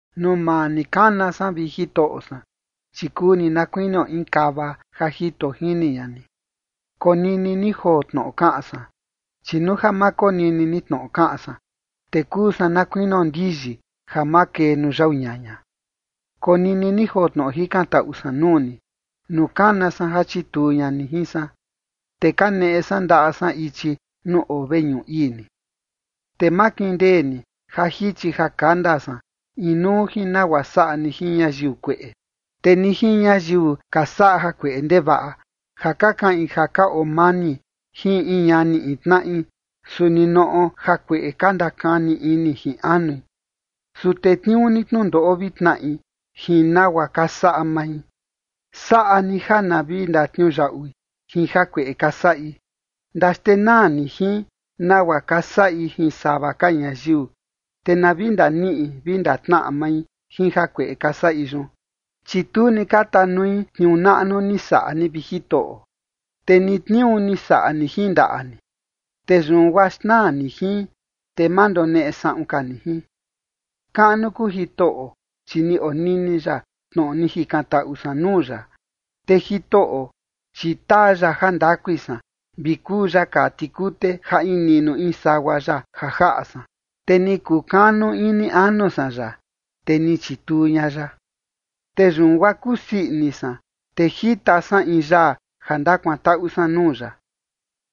Nuu maa ni kana san, vi Jitoꞌo san, chi kuu ni na kuinio in kava ja jito jini ña ni. Konini ni joo tnoꞌo kaꞌan san, chi nuu ja ma konini ni tnoꞌo kaꞌan san, te kuu san na kuinio ndiyi ja makee nuu yau ñaña. Konini ni joo tnoꞌo jikantaꞌu san nuu ni, nuu kana san ja chituu ña ni jin san, te kaneꞌe san ndaꞌa san ichi nuu oo veñuꞌu ii ni. Te ma kindee ni ja jichi ja kanda san inuu jin nagua saꞌa ni jin ñayiu kueꞌe, te ni jin ñayiu ka saꞌa jakueꞌe ndevaꞌa, ja ka kaꞌin ja ka oo mani jin in ñani in tnaꞌi, su ninoꞌo jakueꞌe ka ndakani ini jin anui. Su tetniuu ni tnundoꞌo vi tnaꞌi jin nagua ka saꞌa mai. Saꞌa ni ja na vi ndatniuyaꞌui jin jakueꞌe ka saꞌi. Ndaxtenaa ni jin nagua ka saꞌi jin sava ka ñayiu, te na vi ndaniꞌi vi ndatnaꞌa mai jin jakueꞌe ka saꞌi yun. Chi tu ni ka tanui tniuu naꞌnu ni saꞌa ni, vi Jitoꞌo, te ni tniuu ni saꞌa ni jin ndaꞌa ni, te yun guaa xnaa ni jin, te ma ndoneꞌe saꞌun ka ni jin. Kaꞌnu kuu Jitoꞌo, chi ni onini ya tnoꞌo ni jikantaꞌu san nuu ya. Te Jitoꞌo, chi taa ya jandakui san, vi kuu ya kaa tikute ja in niꞌnu in sagua ya ja jaꞌa san, te ni kukanu ini anu san ya, te ni chituu ña ya. Te yun guaa kusii ini san, te jita san in yaa ja ndakuantaꞌu san nuu ya.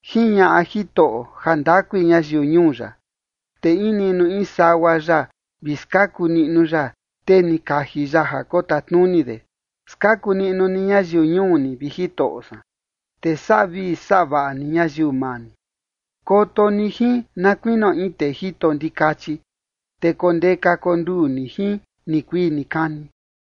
Jiñaꞌa Jitoꞌo jandakui ñayiu ñuu ya, te in niꞌnu in sagua ya vi skaku niꞌnu ya tee ni kaji ya ja kotatnuni de. Skaku ni ñayiu ñuu ni, vi Jitoꞌo san, te saꞌa vii saꞌa vaꞌa ni ñayiu maa ni. Koto ni jin na kuinio in tee jito ndikachi, te kondeka konduu ni jin nikuii nikani.